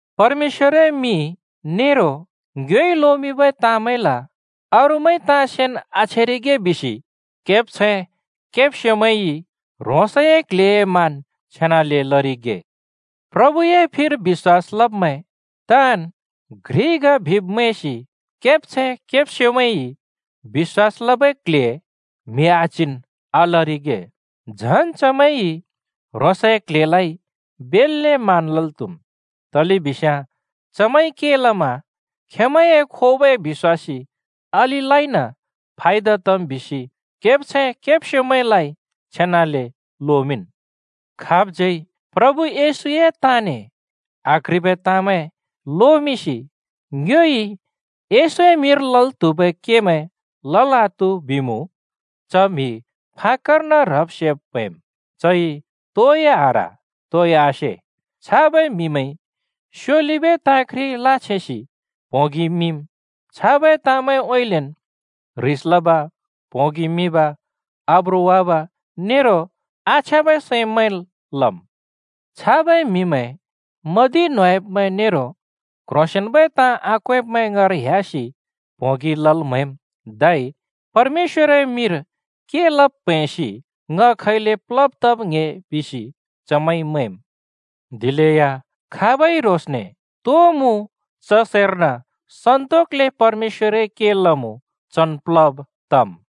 परमेश्‍वरए मिं नेरो ङ्योइ लोमिंबै ताँमैंल अरूइ ताँ सेन् आछेरिगे बिसि केब्छैं केब्स्योमैंइ ह्रोंसए क्ल्हेए मान छेनाले लरिगे। प्रभुए फिर बिश्‍वास लब्मैं ताँन् घ्रिन् ग बिब् मैंसि केब्छैं केब्स्योमैंइ बिश्‍वास लबै क्ल्हे म्हि आच्हिन् आलरिगे, झन् चमैंइ ह्रोंसए क्ल्हेलाइ बेल्‍ले मान लल् त्हुम्। तलेबिस्याँ चमैंइ के लमा खेंमैंए खोबै बिश्‍वासी अलिलाइन फायदा तम् बिसि केब्छैं केब्स्योमैंलाइ छेनाले लोमिंन्। खाबज्यै प्रभु येशूए ताँने आक्ह्रिबै ताँमैं लोमिंसि ङ्योइ येशूए मिंर लल् त्हुबै केमैं लल् आत्हु बिमुँ, च म्‍हि फाक्‍कर्न ह्रब सेब प्‍हैंम्, चइ तोइ आह्र, तोइ आसे। छाबै म्‍हिमैंइ स्योलिबै ताँ घ्रि लाछेंसि प्‍होंगि मिम्, छाबै ताँमैंउँइँलेन् ह्रिस लब, प्होंगि मिब, आब्रु वाब नेरो आछ्याँबै सैं मैंल् लम्। छाबै म्हिमैं मदि न्होंयाब्मैं नेरो क्ह्रोंसेंन्बै ताँ आक्वेंब्मैं ङाँर ह्‍यासि प्होंगि लल् म्हैम्, धै परमेश्‍वरए मिंर के लब् प्हैंसि ङ खैले प्लब् तब् ङ्‍हे बिसि चमैंइ मैंम्। दिलेया खाबइ ह्रोंसने तो मुँ च सैर्न सन्तोकले परमेश्‍वरए के लमुँ चन् प्लब् तम्।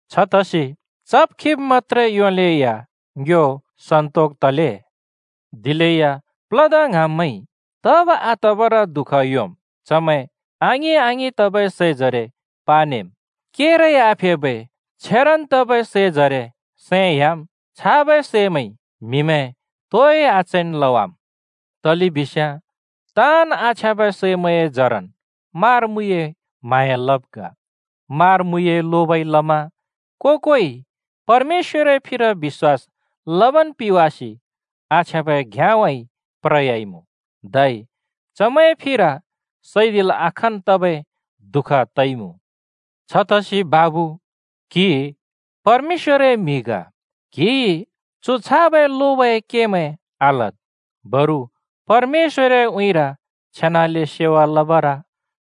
छतसि चब् खिब् मत्‍त्रे योलेया ङ्यो सन्‍तोक तले। दिलेया प्लदा ङ्हाँब्मैंइ तब आतबर दुःख योंम्, चमैं आङिं-आङिं तबै सैजरे पानेम्, केरै आफेबै छेरन् तबै सै जरे सैं ह्‍याम्, छाबै सैमैंइ म्हिमैं तोइ आचैन् लवाम्। तलेबिस्याँ ताँन् आछ्याँबै सैमैंए जरन् मारा-मुइए म्हाँया लब् ग। मारा-मुइए लोबइ लमा को-कोइ परमेश्‍वरए फिर बिश्‍वास लबन् पिवासि आछ्याँबै घ्याँउँइँ प्रयाइमुँ, धै चमैंए फिर सैदिलै आखाँन् तबै दुःख तइमुँ। छतसि बाबु, क्‍हि परमेश्‍वरए म्‍हि ग। क्‍हिइ चु छाबै लोबए केमैं आलद्। बरु परमेश्‍वरए उँइँर छेनाले सेवा लबर,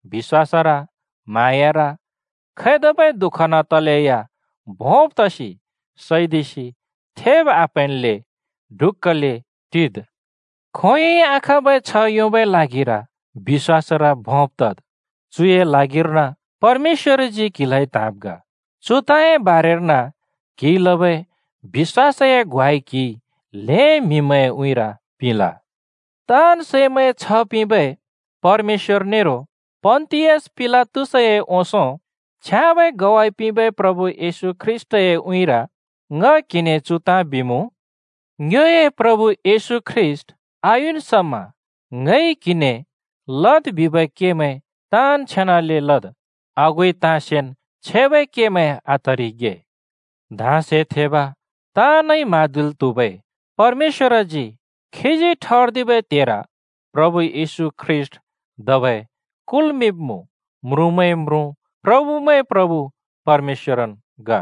बिश्‍वासर, म्हाँयार, खैतबै दुःखन् तलेया भोंब् तसि सैदिसि थेब् आप्हैंनले ढुक्‍कले टिद्। खोंयोंइ आखाँबै छ्ह योंबै ल्हागिर बिश्‍वासर भोंब् तद्। चुए ल्हागिर्न परमेश्‍वरजी क्हिलाइ त्‍हाँब् ग, चु ताँए बारेर्न क्हिइ लबै बिश्‍वासए ग्वाइ क्हिइ ल्‍हें म्‍हिमैंए उँइँर पिंल। ताँन् सैमैंए छ्ह पिंबै परमेश्‍वर नेरो पन्‍तियस पिलातसए ओंसों छ्याँबै ग्वाइ पिंबै प्रभु येशू ख्रीष्‍टए उँइँर ङ क्हिने चु ताँ बिमुँ: ङ्योए प्रभु येशू ख्रीष्‍ट आयुन् समा ङइ क्हिने लद् बिबै केमैं ताँन् छेनाले लद्। आगुइ ताँ सेन् छेबै केमैं आतरिगे। धाँसे थेब ताँनइ म्हाँदिल् त्हुबै परमेश्‍वरजी खीजी ठर्दिबै त्हेर प्रभु येशू ख्रीष्‍ट धबै कुल्मिंब्‍मुँ। म्रुँमैंए म्रुँ, प्रभुमैंए प्रभु परमेश्‍वरन् ग।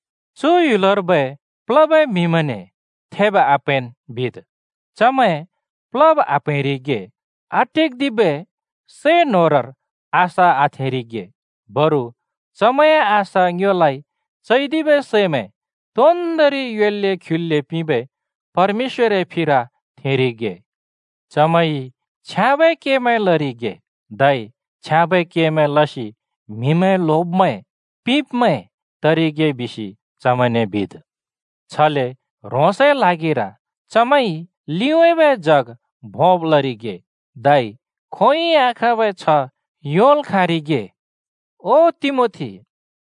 चु ह्‍युलर्बै प्लबै म्हिमैंने थेब् आप्हैंन् बिद्, चमैं प्लब् आप्‍हैंरिगे, आटिक्‍दिबै सै न्होरर आशा आथेंरिगे, बरु चमैंए आशा ङ्योलाइ चैदिबै सैमैं तोन्दोंरि योल्‍ले ख्युल्‍ले पिंबै परमेश्‍वरए फिर थेंरिगे। चमैंइ छ्याँबै केमैं लरिगे, धै छ्याँबै केमैं लसि म्हिमैं ल्होब्मैं, पिंब्मैं तरिगे बिसि चमैंने बिद्। छले ह्रोंसए ल्हागिर चमैंइ लिउँइँबै जग भोंब् लरिगे, धै खोंयोंइ आखाँबै छ्ह योंल् खाँरिगे। ओ तिमोथी,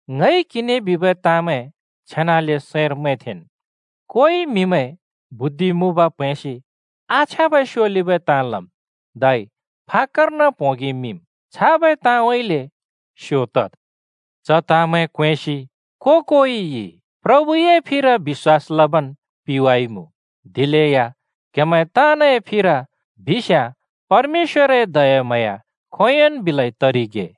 ङइ क्हिने बिबै ताँमैं छेनाले सैंर मैंथेंन्। कोइ म्हिमैं बुद्धि मुँब प्‍हैंसि आछ्याँबै स्योलिबै ताँ लम्, धै फाक्‍कर्न प्होंगि मिम्। छाबै ताँउँइँले स्‍यो तद्। च ताँमैं क्वेंसि को-कोइइ प्रभुए फिर बिश्‍वास लबन् पिवाइमुँ। दिलेया क्हेमैं ताँनए फिर बिस्याँ परमेश्‍वरए दयाम्हाँया खोंयोंन् बिलै तरिगे।